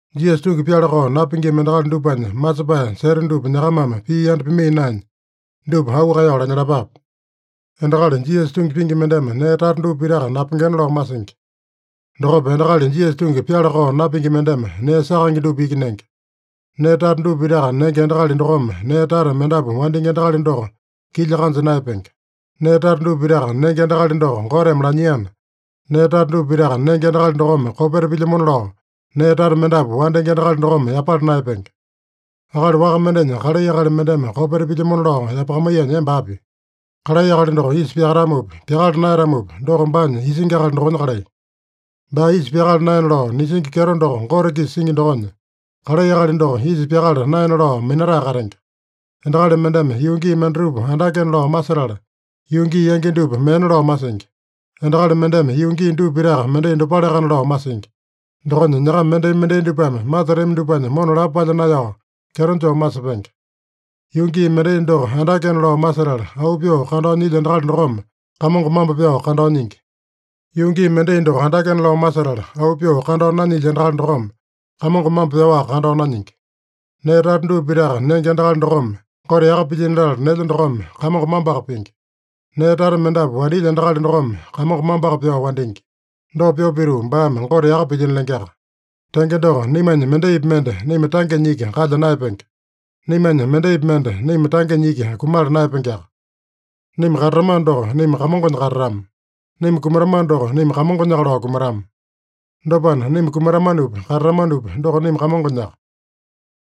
Jisasa tungi pyala-kao napingima endakali dupanya masepae seta dupa nyakamame pii yanda pimaiya naenya, dupa auu kaeyao lanyalapape. Endakali Jisasa tungi pingi mendeme nee tata dupa pitaka napengena lao masingi. Dokopa endakali Jisasa tungi pyala-kao napingi mendeme nee sakaenge dupa iki nenge. Nee tata dupa pitaka nenge endakali dokome nee tata mendapu wandingi endakali doko kilya kanja naeyapenge. Nee tata dupa pitaka nenge endakali doko Goteme lanyiana, nee tata dupa pitaka nenge endakali dokome kopeta pilyamona lao, nee tata mendapu wandingi endakali dokome yapala naeyapenge. Akali waka mendenya kalai akali mendeme kopeta pilyamona lao yapakamaiyanya emba api? Kalai akali doko isa pyakatamopi, pyakala naeyatamopi, doko baanya isingi akali dokonya kalai. Baa isa pyakala naena lao nisingi kyeto doko Gote-kisa singi dokonya, kalai akali doko isa pyakala naena lao minatae katenge. Endakali mendeme yuu gii mendatupa andakena lao masetala, yuu gii yangi dupa meena lao masingi. Endakali mendeme yuu gii dupa pitaka mendai dopaleakana lao masingi. Dokonya nyakama mendai-mendai dupame masetami dupanya mona lapo palya naeyao kyeto joo masepenge. Yuu gii mendai doko andakena lao masetala auu pyoo kandao nyilya endakali dokome Kamongo mambo pyao kandao nyingi. Yuu gii mendai doko andakena lao masetala auu pyoo kandao nanyilya endakali dokome Kamongo mambo pyaowaka kandao nanyingi. Nee tata dupa pitaka nenge endakali dokome, Gote yaka pilyino latala nelya dokome, Kamongo mamboaka pingi. Nee tata mendapu wandilya endakali dokome Kamongo mamboaka pyao wandingi. Dopa pyoo pituu baame Gote yaka pilyino lengeaka. Tenge doko, naimanya mendaipi mende naima tangenya iki kalya naeyapenge. Naimanya mendaipi mende naima tangenya iki kumala naeyapengeaka. Naima katatamano doko, naima Kamongonya katatama. Naima kumatamano doko, naima Kamongonyaka lao kumatama. Dopana, naima katatamanopi, kumatamanopi, doko naima Kamongonyaka.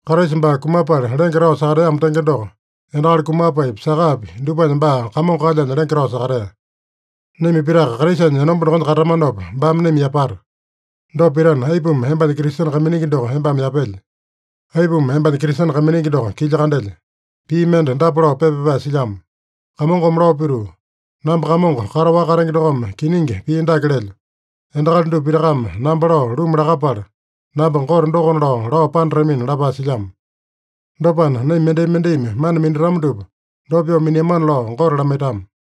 Kraisa baa kumapala lenge tao sakateamo tenge doko, endakali kumapaepi, sakapi dupanya baa Kamongo kalyanya lenge tao sakatea. Naima pitaka Kraisanya enomba dokonya katatamanopa baame naima yapata. Dopa pitana, aipuma embanya Kristene kaiminingi doko embame yapelye? Aipuma embanya Kristene kaiminingi doko kilya kandelye? Pii mende dapa lao pepa pyapae silyamo: “Kamongome lao pituu, ‘Namba Kamongo kataowaka katenge dokome kiningi pii dake lelyo: Endakali dupa pitakame namba lao luma lakapala, namba Gote dokona lao, lao panatamina’” lapae silyamo. Dopana, naima mendai-mendaimi mana minatama dupa dopa pyoo miniamana lao Gote lamaitama.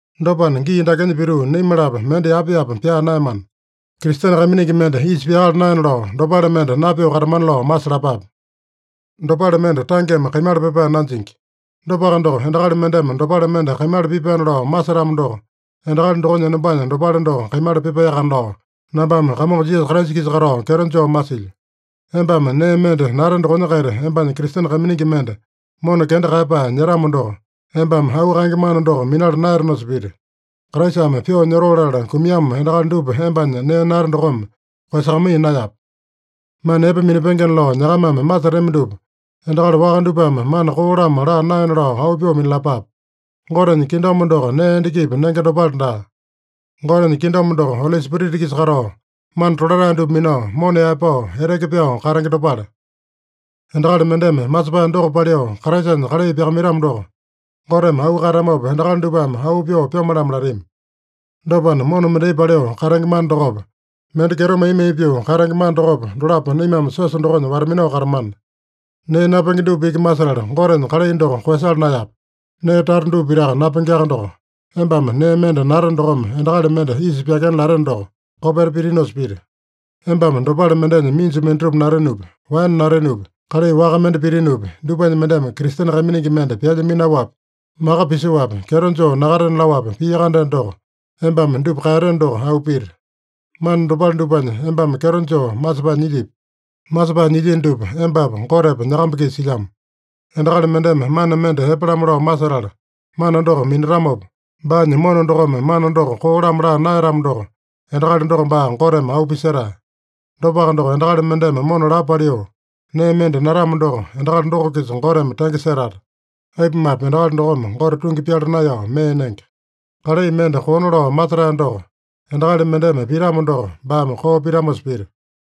Dopana, gii dakenya pituu naima-lapo mende yapa-yapa pyaa naeyamana. Kristene kaiminingi mende isa pyakala naena lao, dopale mende napyoo katamana lao masalapape. Dopale mende tangeme kaimala pipae nanjingi. Dopaka doko, endakali mendeme dopale mende kaimala pipaena lao masetamo doko, endakali dokonya enombanya dopale doko kaimala pipaeyakana lao, nambame Kamongo Jisasa-kisa katao kyeto joo masilyo. Embame nee mende nate dokonya-kaita embanya Kristene kaiminingi mende mona kenda kaeyapae nyetamo doko, embame auu kaenge mana doko minala naeyatenosa pita. Kraisame pyoo nyotoo latala kumiamo endakali dupa embanya nee nate dokome koeyasakamaiya naeyape. Mana epe minapengena lao nyakamame masetami dupa endakali waka dupame mana koo-lamo laa naena lao auu pyoo minalapape. Gotenya kingdom doko nee endakipi nenge dopale daa. Gotenya kingdom doko, Oli Spirita-kisa katao, mana tolatae dupa minao, mona yaepao, eteke pyao katenge dopale. Endakali mendeme masepae doko paliu Kraisanya kalai pyakamaitamo doko, Goteme auu kaeyatamopa endakali dupame auu pyoo pyome-lamo latami. Dopana, mona mendai paliu katenge mana dokopa, mende kyeto mai-mai pyoo katenge mana dokopa, dolapo naimame siosa dokonya wata-minao katamana. Nee napenge dupa iki masetala Gotenya kalai doko koeyasala naeyape. Nee tata dupa pitaka napengeaka doko, embame nee mende nate dokome endakali mende isa pyakena lateno doko, kopeta pitinosa pita. Embame dopale mendenya minju mendatupa natenopi, waene natenopi, kalai waka mende pitinopi, dupanya mendeme Kristene kaiminingi mende pyalya minaowapi, maka pisoapi, kyeto joo nakatena laowapi pia-kandeno doko, embame dupa kaeyateno doko auu pita. Mana dopale dupanya embame kyeto joo masepae nyilyipi? Masepae nyilyino dupa embapa, Gotepa, nyakamba-kisa silyamo. Endakali mendeme mana mende epe-lamo lao masetala mana doko minatamopa, baanya mona dokome mana doko koo-lamo laa naeyatamo doko, endakali doko baa Goteme auu pisetae. Dopaka doko, endakali mendeme mona lapo paliu nee mende natamo doko, endakali doko-kisa Goteme tenge setata. Aipumape, endakali dokome Gote tungi pyala naeyao mee nenge. Kalai mende koona lao masetae doko endakali mendeme pitamo doko, baame koo pitamosa pita.